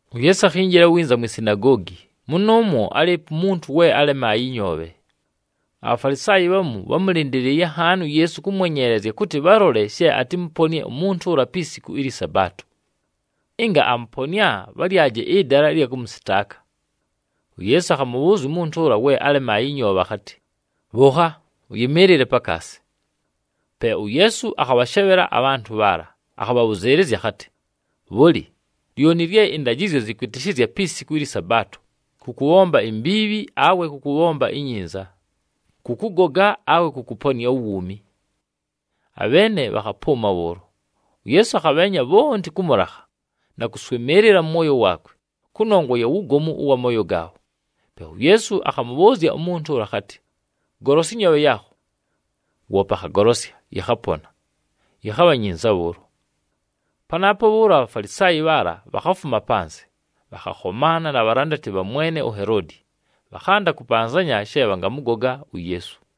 UYeesu akhinjila winza mwi sinagoogi, mʉnʉʉmwo álɨɨpo umuntu we álemaaye ɨnyoobhe. ABhafalisaayi bhamu bhámʉlɨndɨlɨɨye nhaani uYeesu kʉmwenyeelezya kʉtɨ bhalole she atɨmʉponɨe umuntu ʉla pi siku ɨlyɨ Sabaato. Ɨnga amʉponɨa, bhalyaje ɨdala ɨlya kʉmʉsɨtaaka. UYeesu akhamʉbhʉʉzya umuntu ʉla we álemaaye ɨnyoobhe akhatɨ, “Bhʉʉkha, ʉyɨmɨɨlɨle pakaasi.” Pe uYeesu akhabhashebhela abhantʉ bhaala, akhabhabhʉzɨɨlɨzya akhatɨ, “Bhʉlɨ, lyoni lye ɨndajɨzyo zɨkwɨtɨshɨzya pi siku ɨlyɨ Sabaato, kʉ kʉbhomba imbiibhi, awe kʉ kʉbhomba inyinza, kʉ kʉgoga awe kʉ kʉponɨa uwuumi?” Abheene bhakhapʉʉma bhʉʉlo. UYeesu akhabheenya bhonti kʉ mʉlakha na kʉswɨmɨɨlɨla mʉ mwoyo waakwe, kʉnongwa ya wugomu ʉwa mooyo gaabho. Pe uYeesu akhamʉbhʉʉzya umuntu ʉla akhatɨ, “Golosya ɨnyoobhe yaakho.” Woope akhagolosya, yɨkhapona, yɨkhabha nyinza bhʉʉlo. Panaapo bhʉʉlo aBhafalisaayi bhaala bhakhafuma panzɨ, bhakhakhomaana na bhalandati bha mwene uHeloodi, bhakhanda kʉpanzanya she bhangamʉgoga uYeesu.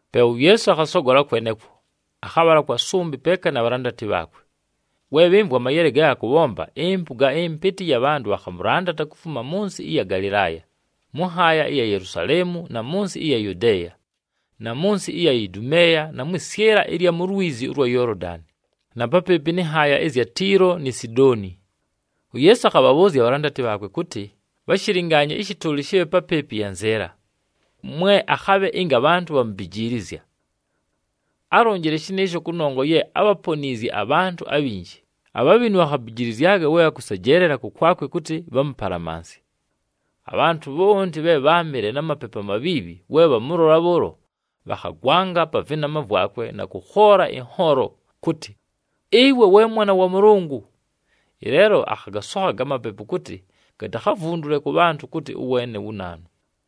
Pe uYeesu akhasogola kwenekwo, akhabhala kwa sʉmbɨ peeka na bhalandati bhaakwe. We bhɨmvwa amayele ge akʉbhomba, ɨmpʉga ɨmpɨtɨ ɨya bhantʉ bhakhamʉlandata kufuma mʉ nsɨ ɨya Galɨlaaya, mʉ nhaaya ɨya Yelusaleemu na mʉ nsɨ ɨya Yudeeya, na mʉ nsɨ ɨya Idumeeya, na mwɨ syɨla ɨya lwizi ʉlwa Yoolodani, na papɨɨpɨ nɨ nhaaya ɨzya Tiilo ni Sidooni. UYeesu akhabhabhʉʉzya abhalandati bhaakwe kʉtɨ bhashɨlɨngaanye ɨshɨtʉʉlɨ shɨbhe papɨɨpɨ yanzɨɨla, mwe akhabhe, ɨnga abhantʉ bhamubijiilizya. Álonjile shɨnɨɨsho kʉnongwa ye ábhaponiizye abhantʉ abhinji, abhabhinu bhakhabijilizyaga we bhakʉsejeelela kʉkwakwe kʉtɨ bhamʉpalamansye. Abhantʉ bhonti bhe bháamɨle na mapepu amabhiibhi we bhamʉlola bhʉʉlo, bhakhagwanga pa vɨnama vwakwe na kʉkhoola ɨnhoolo, kʉtɨ, “Ɨwe we Mwana wa Mʉlʉngʉ!” Ɨleelo akhagasokha amapepu kʉtɨ gatakhavundule kʉ bhantʉ kʉtɨ ʉweene wu naanu.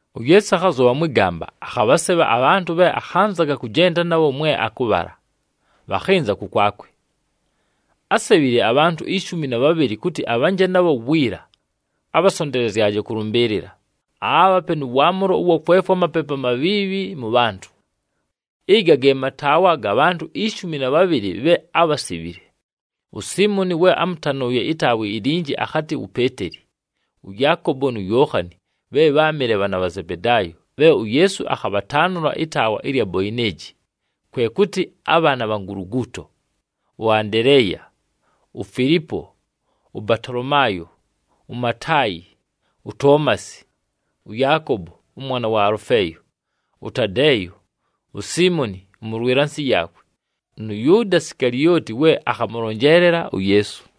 UYeesu akhazʉbha mwɨ gamba, akhabhasebha abhantʉ bhe akhanzaga kʉjenda nabho mwe akʉbhala, bhakhɨnza kʉkwakwe. Ásebhile abhantʉ ishumi na bhabhɨlɨ kʉtɨ abhanje nabho wiila, abhasontelezyaje kʉlʉmbɨɨlɨla, aabhape nʉ waamʉlo ʉwa kwefwa amapepu amabhiibhi mʉ bhantʉ. Ɨga ge mataawa ga bhantʉ ishumi na bhabhɨlɨ bhe ábhasebhile: uSiimoni we ámʉtanʉʉye ɨtaawa ilinji, akhatɨ wu Peeteli, ʉYaakobo nu Yookhani bhe bháamɨle bhaana bha Zebedaayo bhe uYeesu akhabhataanʉla ɨtaawa ɨlya Boeneji, kwe kʉtɨ, “ABhaana bha Nguluguuto,” ʉAndeleeya, uFilipo, ʉBatolomaayo, uMataayi, uToomasi, ʉYaakobo ʉmwana wa Alʉfeeyo, ʉTadeeyo, uSiimoni ʉmʉlwɨla nsɨ yaakwe, nʉ Yʉʉda Sikalioti, we akhamʉlonjeelela uYeesu.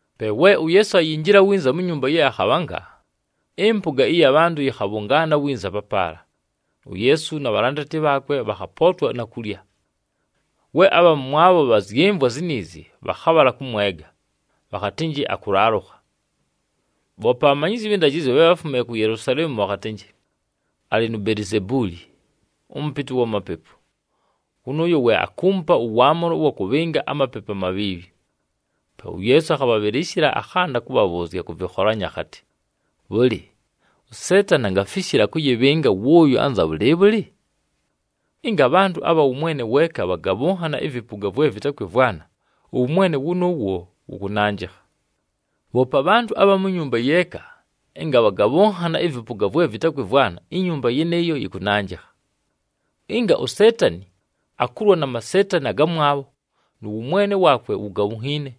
Pe we uYeesu ayinjila winza mu nyumba ye akhabhanga, ɨmpʉga ɨya bhantʉ yɨkhabhʉngaana winza papaala, uYeesu na bhalandati bhaakwe bhakhapootwa na kulya. We abha mʉmwabho bhazyɨmvwa ziniizi, bhakhabhala kʉmwega, bhakhatɨnjɨ akʉlaalʉkha. Bhoope abhamanyizyi abhɨ ndajɨzyo bhe bháfumile ku Yelusaleemu bhakhatɨnjɨ, “Alɨ nu Belizebuuli, ʉmʉpɨtɨ wa mapepu! Wʉnʉʉyo we akuumupa ʉwaamʉlo ʉwa kʉbhɨnga amapepu amabhiibhi.” Pe uYeesu akhabhabhɨlɨshɨla, akhanda kʉbhabhʉʉzya kʉ vɨkholanyo akhatɨ, “Bhʉlɨ, uSeetani angafishila kʉyɨbhɨnga wʉʉyo anza bhʉlɨɨbhʉlɨ? Ɨnga abhantʉ abha wʉmwene weeka bhagabhʉnhana ɨvɨpʉga vwe vɨtakwɨmvwana, ʉwʉmwene wʉnʉʉwo wʉkʉnanjɨkha. Bhoope abhantʉ abha mu nyumba yeeka ɨnga bhagabhʉnhana ɨvɨpʉga vwe vɨtakwɨmvwana, inyumba yɨnɨɨyo yɨkʉnanjɨkha. Ɨnga uSeetani akulwa na maseetani agamwabho nʉ wʉmwene waakwe wugabhunhiine,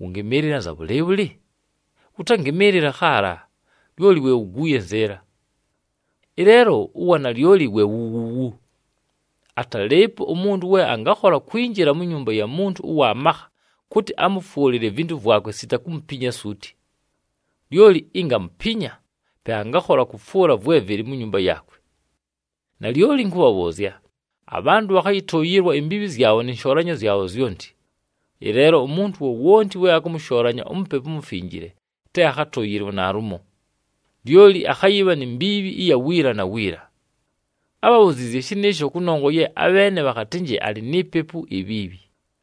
wʉngɨmɨɨlɨla anza bhʉlɨɨbhʉlɨ? Wʉtangɨmɨɨlɨla khaala, lyoli we wuguuye nzɨɨla. Ɨleelo uwanalyoli we wu wuuwu: atalɨɨpo umuntu we angakhola kwinjila mu nyumba ya muntu ʉwa makha kʉtɨ amʉfwʉlɨle ivintu vwakwe sita kumupinya suuti. Lyoli ɨnga amupinya, pe angakhola kʉfwʉla vwe vɨlɨ mu nyumba yaakwe. “Nalyoli ɨnkʉbhabhʉʉzya, abhantʉ bhakhayɨtʉʉyɨlwa imbiibhi zyabho nɨ nshoolanyo zyabho zyonti. Ɨleelo umuntu wowonti we akʉmʉshoolanya uMupepu uMufinjile, te akhatʉʉyɨlwe naalumo. Lyoli akhayɨbha ni mbiibhi ɨya wiila na wiila.” Ábhabhuziizye shɨnɨɨsho kʉnongwa ye abheene bhakhatɨnjɨ alɨ ni pepu ibhiibhi.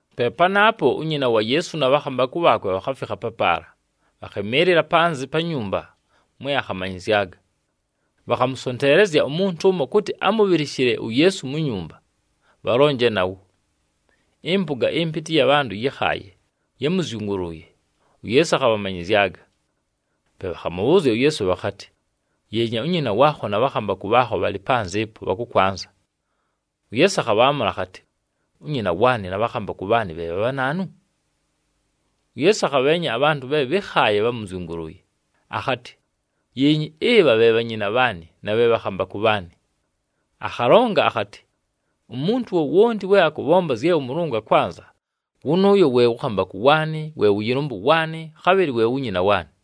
Pe panaapo, unyina wa Yeesu na bhakhambakʉ bhaakwe bhakhafikha papaala, bhakhɨmɨɨlɨla panzɨ pa nyumba mwe akhamanyɨzyaga. Bhakhamʉsonteelezya umuntu ʉmo kʉtɨ amʉbhɨlɨshɨle uYeesu mu nyumba, bhalonje nawo. Ɨmpʉga ɨmpɨtɨ ɨya bhantʉ yɨ́khaaye, yámʉzyʉgʉlʉʉye, uYeesu akhabhamanyɨzyaga. Pe bhakhamʉbhʉʉzya uYeesu bhakhatɨ, “Yeenya, unyina waakho na bhakhambakʉ bhaakho bhalɨ panzɨ ɨpo, bhakʉkwanza.” UYeesu akhaamʉla akhatɨ, “Unyina waanɨ na bhakhambakʉ bhaanɨ bhe bha bhanaanu?” UYeesu akhabheenya abhantʉ bhe bhɨ́khaaye bhámʉzyʉngʉlʉʉye, akhatɨ, “Yeenyi, ɨbha bhe bhanyina bhaanɨ na bhe bhakhambakʉ bhaanɨ.” Akhalonga akhatɨ, “Umuntu wowonti we akʉbhomba zye ʉMʉlʉngʉ akwanza, wʉnʉʉyo we wʉ khambakʉ waanɨ, we wʉ yɨlʉmbʉ waanɨ, khabhɨlɨ we wu nyina waanɨ.”